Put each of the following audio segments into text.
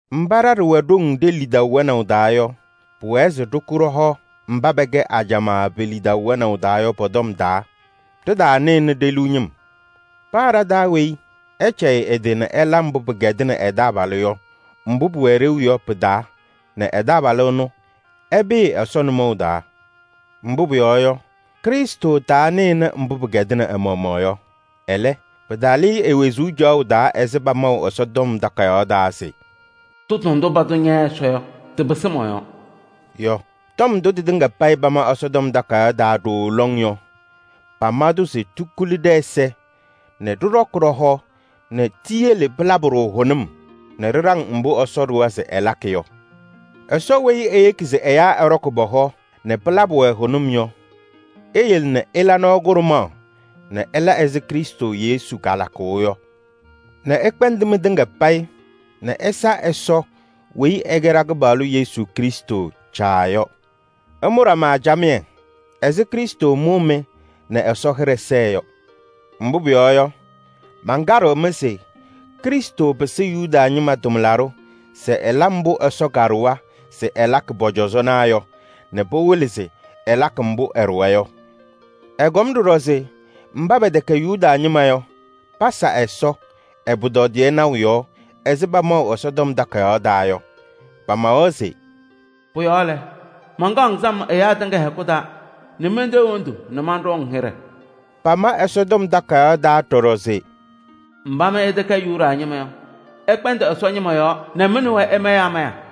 Mba ɖa ɖɩwɛ ɖoŋ ɖe-lidaʋ wɛnaʋ taa yɔ, pʋwɛɛ se ɖɩkʋ ɖɔ-hɔ mba pɛkɛ ajamaa pe-lidaʋ wɛnaʋ taa yɔ pɔ-tɔm taa, ɖɩtaanɩnɩ ɖe-liu ñɩm. Paa ɖa-taa weyi, ɛcɛyɩ ɛ-tɩ nɛ ɛla mbʋ pɩkɛdɩnɩ ɛ-taabalʋ yɔ, mbʋ pʋwɛ ɖeu yɔ pɩ-taa nɛ ɛ-taabalʋ ɛnʋ, ɛpɩɩ Ɛsɔ nʋmɔʋ taa. Mbʋ pʋyɔɔ yɔ, Krɩstʋ tanɩnɩ mbʋ pɩkɛdɩnɩ ɛ-maɣmaɣ yɔ. Ɛlɛ, pɩtalɩ-ɩ e-wezuu caɣʋ taa ɛzɩ pamaʋ Ɛsɔtɔm Takayaɣ taa se: “Tʋtʋ ndʋ patʋ ña Ɛsɔ yɔ, tɩpɩsɩ mɔ-yɔɔ” yɔ. Tɔm ndʋ tɩtɩŋa payɩ pama Ɛsɔtɔm Takayaɣ taa ɖooo lɔŋ yɔ, pama-tʋ se tikuli ɖɛ-ɛza nɛ ɖɩɖɔkɩ ɖɔ-hɔ nɛ tiyele pɩlabɩ-ɖʋ hʋnʋm nɛ ɖɩɖaŋ mbʋ Ɛsɔ ɖʋwa se ɛlakɩ yɔ. Ɛsɔ weyi eyeki se ɛyaa ɛɖɔkɩ pɔ-hɔ nɛ pɩlabɩ-wɛ hʋnʋm yɔ, eyele nɛ ɩla nɔɔ kʋɖʋmaɣ nɛ ɩla ɛzɩ Krɩstʋ Yesu kalakʋʋ yɔ nɛ ɩkpɛndɩ mɩtɩŋa payɩ nɛ ɩsa Ɛsɔ weyi ɛkɛ ɖa-Kɩpaɣlʋ Yesu Krɩstʋ Caa yɔ. Ɩmʋ ɖama camɩyɛ ɛzɩ Krɩstʋ mʋʋ-mɩ nɛ Ɛsɔ hɩɖɛ sɛɛ yɔ. Mbʋ pʋyɔɔ yɔ, mankaɖɩɣ-mɩ se Krɩstʋ pɩsɩ Yuda ñɩma tʋmlaɖʋ se ɛla mbʋ Ɛsɔ kaɖʋwa se ɛlakɩ pɔ-cɔzɔnaa yɔ nɛ pɩwɩlɩ se ɛlakɩ mbʋ ɛɖʋwa yɔ. Ɛkɔm ɖɔɖɔ se mba pɛtɛkɛ Yuda ñɩma yɔ, pasa Ɛsɔ ɛ-pʋtɔdɩyɛ naʋ yɔɔ ɛzɩ pamaʋ Ɛsɔtɔm Takayaɣ taa yɔ. Pamawa se: “Pʋ-yɔɔ mankaɣ-ŋ sam mba pɛtɛkɛ Yuda ñɩma yɔ pɛ-hɛkʋ taa nɛ mentee hendu nɛ manɖʋ-ŋ hɩɖɛ.” Pamawa ɖɔɖɔ se: “Mba mɩ ɩtɛkɛ Yuda ñɩma yɔ, ɩkpɛndɩ Ɛsɔ ñɩma yɔɔ nɛ mɩ nɛ wɛ ɩmayɩ amaya.”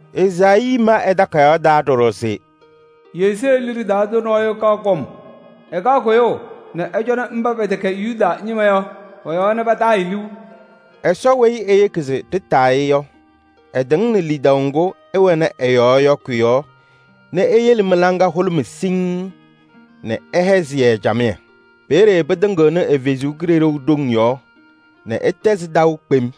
Ezaayii ma ɛ-takayaɣ taa ɖɔɖɔ se: “Yesee liɖe taa tʋ kaɣ kɔm nɛ ɛcɔnɩ mba pɛtɛkɛ Yuda ñɩma yɔ pɔ-yɔɔ nɛ pataa-ɩ liu.” Ɛsɔ weyi eyeki se ɖɩtaa-ɩ yɔ, ɛtɩŋnɩ lidaʋ ŋgʋ ɩwɛnɩ ɛ-yɔɔ yɔ kʋ-yɔɔ nɛ eyele mɩ-laŋa hʋlʋmɩ siŋŋ nɛ ɛhɛzɩ-yɛ camɩyɛ. Peeye pɩtɩŋɩɣnɩ ɛ-Kalɩzaɣ ɖoŋ yɔɔ nɛ ɩtɛzɩ-ɩ taʋ kpem.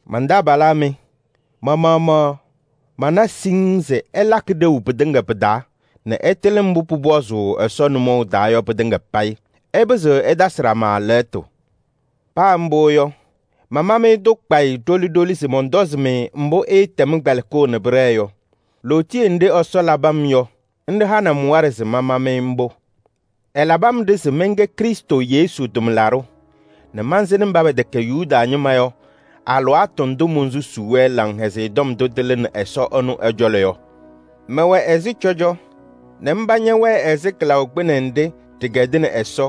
Man-taabalaa mɩ, ma-maɣmaɣ mana siŋŋ se ɩlakɩ ɖeu pɩtɩŋa pɩ-taa nɛ ɩtɩlɩ mbʋ pʋpɔzʋʋ Ɛsɔ nʋmɔʋ taa yɔ pɩtɩŋa payɩ. Ɩpɩzɩɣ ɩtasɩ ɖama tɔm. Paa mbʋ yɔ, mama-mɩ-tʋ kpayɩ ɖoli ɖoli se mɔntɔzɩ-mɩ mbʋ ɩɩtɛm kpɛlɩkʋʋ nɛ pɩɖɛɛ yɔ. Lootiye nɖɩ Ɛsɔ labɩ-m yɔ, nɖɩ hanɩ-m waɖɛ se mama-mɩ mbʋ. Ɛlabɩ-m-ɖɩ se mɛnkɛ Krɩstʋ Yesu tʋmlaɖʋ nɛ mansɩnɩ mba pɛtɛkɛ Yuda ñɩma yɔ alɩwaatʋ ndʋ monsusuu-wɛ Laŋhɛzɩyɛ Tɔm ndʋ tɩlɩnɩ Ɛsɔ ɛnʋ ɛ-cɔlɔ yɔ, mɛwɛ ɛzɩ cɔjɔ nɛ mba ñɛwɛɛ ɛzɩ kɩlaʋ kpɩnɛ nɖɩ ɖɩkɛdɩnɩ Ɛsɔ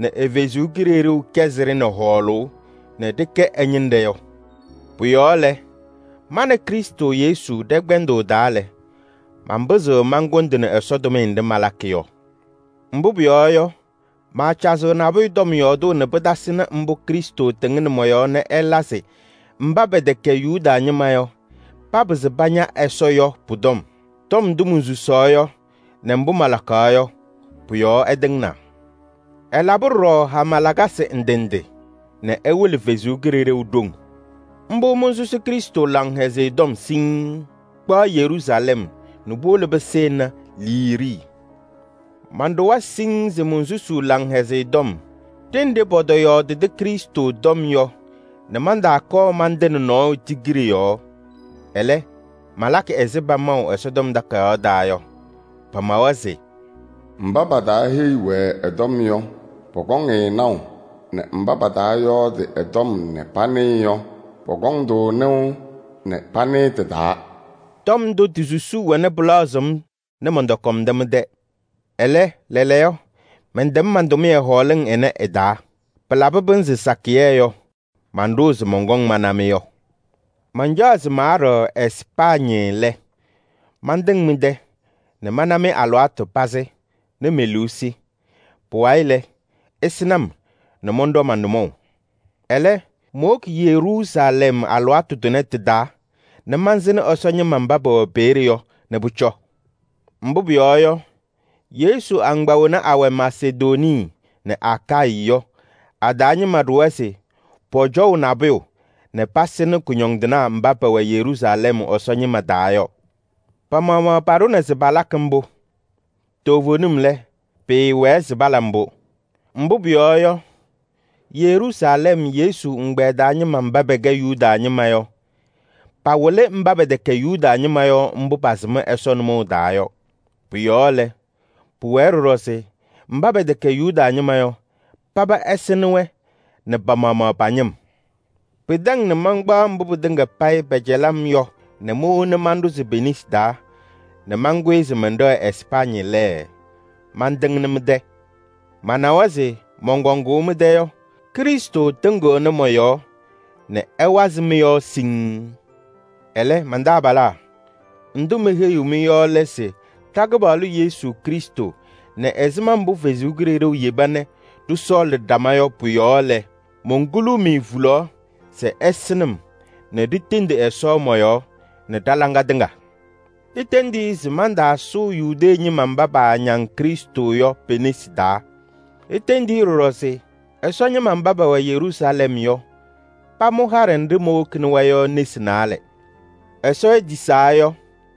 nɛ ɛ-Kalɩzaɣ kɛzɩ-ɖɩ nɛ hɔɔlʋʋ nɛ ɖɩkɛ ɛ-ñɩnɖɛ yɔ. Pʋ-yɔɔ lɛ, ma nɛ Krɩstʋ Yesu ɖɛ-kpɛndʋʋ taa lɛ, manpɩzɩɣ mankʋndɩnɩ Ɛsɔ tʋmɩyɛ nɖɩ malakɩ yɔ. Mbʋ pʋyɔɔ yɔ, maacazɩɣ nabʋyʋ tɔm yɔɔdʋʋ nɛ pɩtasɩnɩ mbʋ Krɩstʋ tɩŋnɩ mɔ-yɔɔ nɛ ɛla se mba pɛtɛkɛ Yuda ñɩma yɔ, papɩzɩ paña Ɛsɔ yɔ pʋ-tɔm. Tɔm ndʋ monsusaɣ yɔ nɛ mbʋ malakaɣ yɔ, pʋ-yɔɔ ɛtɩŋnaa. Ɛlabɩ ɖɔɖɔ hama lakasɩ ndɩ ndɩ nɛ ɛwɩlɩ Ɛsɔ Kalɩzaɣ ɖoŋ. Mbʋ monsusi Krɩstʋ Laŋhɛzɩyɛ Tɔm siŋŋ, kpaɣ Yeruusalɛm nɛ puwolo pɩsɩnɩ Iliirii. Manɖʋwa siŋŋ se monsusuu Laŋhɛzɩyɛ Tɔm ɖenɖe pɔtɔyɔɔdɩdɩ Krɩstʋ tɔm yɔ nɛ mantaakɔɔ mantɩnɩ nɔɔyʋ tigiɖe yɔɔ. Ɛlɛ, malakɩ ɛzɩ pamaʋ Ɛsɔtɔm Takayaɣ taa yɔ. Pamawa se: “Mba pataaheyi-wɛ ɛ-tɔm yɔ, pɔkɔŋ-ɩ naʋ, nɛ mba pataayɔɔdɩ ɛ-tɔm nɛ panɩɩ yɔ, pɔkɔŋ-tʋ nɩʋ nɛ panɩɩ tɩ-taa.” Tɔm ndʋ ti-susuu wɛna pɩlaɣzɩɣ-m nɛ mɔntɔkɔmdɩ mɩ-tɛ. Ɛlɛ, lɛɛlɛɛyɔ mɛntɛm man-tʋmɩyɛ hɔɔlɩŋ ɩnɛ ɩ-taa. Pɩlabɩ pɩnzɩ sakɩyɛ yɔ, manɖʋʋ se mɔnkɔŋ mana-mɩ yɔ. Mancaɣ se maaɖɛɣ Ɛspaañɩ lɛ, mantɩŋ mɩ-tɛ nɛ mana-mɩ alɩwaatʋ pazɩ nɛ me-liu sɩ. Pʋwayɩ lɛ, ɩsɩnɩ-m nɛ mɔnɖɔ ma-nʋmɔʋ. Ɛlɛ, mowoki Yeruusalɛm alɩwaatʋ tʋnɛ tɩ-taa nɛ mansɩnɩ Ɛsɔ ñɩma mba pɛwɛ peeye yɔ nɛ pʋcɔ. Mbʋ pʋyɔɔ yɔ, Yesu agbaa wena awɛ Masedonii nɛ Akayɩ yɔ, a-taa ñɩma ɖʋwa se pɔcɔʋ nabʋyʋ nɛ pasɩnɩ kʋñɔndɩnaa mba pɛwɛ Yeruusalɛm Ɛsɔ ñɩma taa yɔ. Pa-maɣmaɣ paɖʋna se palakɩ mbʋ. Toovenim lɛ, pɩɩwɛɛ se pala mbʋ. Mbʋ pʋyɔɔ yɔ, Yeruusalɛm Yesu ɛgbɛyɛ taa ñɩma mba pɛkɛ Yuda ñɩma yɔ, patayɩnɩ mba pɛtɛkɛ Yuda ñɩma yɔ mbʋ pasɩm Ɛsɔ nʋmɔʋ taa yɔ. Pʋ-yɔɔ lɛ, pʋwɛɛ ɖɔɖɔ se mba pɛtɛkɛ Yuda ñɩma yɔ, paba ɛsɩnɩ-wɛ nɛ pa-maɣmaɣ pa-ñɩm. Pɩtɛŋ nɛ mankpaɣ mbʋ pɩtɩŋa payɩ pɛcɛlɩ-m yɔ nɛ mowona manɖʋzɩ pe-nesi taa nɛ mankʋyɩ se mɛnɖɛɣ Ɛspaañɩ lɛ, mantɩŋnɩ mɩ-tɛ. Manawa se mɔnkɔŋʋʋ mɩ-tɛ yɔ, Krɩstʋ tɩŋɩɣnɩ mɔ-yɔɔ nɛ ɛwazɩ mɩ-yɔɔ siŋŋ. Ɛlɛ, man-taabalaa, ndʋ meheyiɣ-mɩ yɔ lɛ se ɖa-Kɩpaɣlʋ Yesu Krɩstʋ nɛ ɛzɩma mbʋ Ɛsɔ Kalɩzaɣ yeba nɛ ɖɩsɔɔlɩ ɖama yɔ pɔ-yɔɔ lɛ, monkuluu-mɩ hulaɣ se ɩsɩnɩ-m nɛ ɖitendi Ɛsɔ mɔ-yɔɔ nɛ ɖa-laŋa tɩŋa. Itendi-i se mantaasʋʋ Yudee ñɩma mba paañaŋ Krɩstʋ yɔ pe-nesi taa. Itendi-i ɖɔɖɔ se Ɛsɔ ñɩma mba pɛwɛ Yeruusalɛm yɔ, pamʋ haɖɛ nɖɩ mowokini-wɛ yɔ nesi naalɛ. Ɛsɔ etisaa yɔ,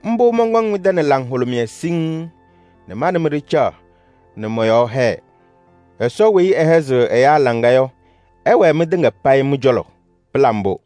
mbʋ mɔnkɔŋ mɩ-tɛ nɛ laŋhʋlʋmɩyɛ siŋŋ nɛ ma nɛ mɩ ɖɩcaɣ nɛ mɔ-yɔɔ hɛɛ. Ɛsɔ weyi ɛhɛzɩɣ ɛyaa laŋa yɔ, ɛwɛɛ mɩtɩŋa payɩ mɩ-cɔlɔ. Pɩla mbʋ!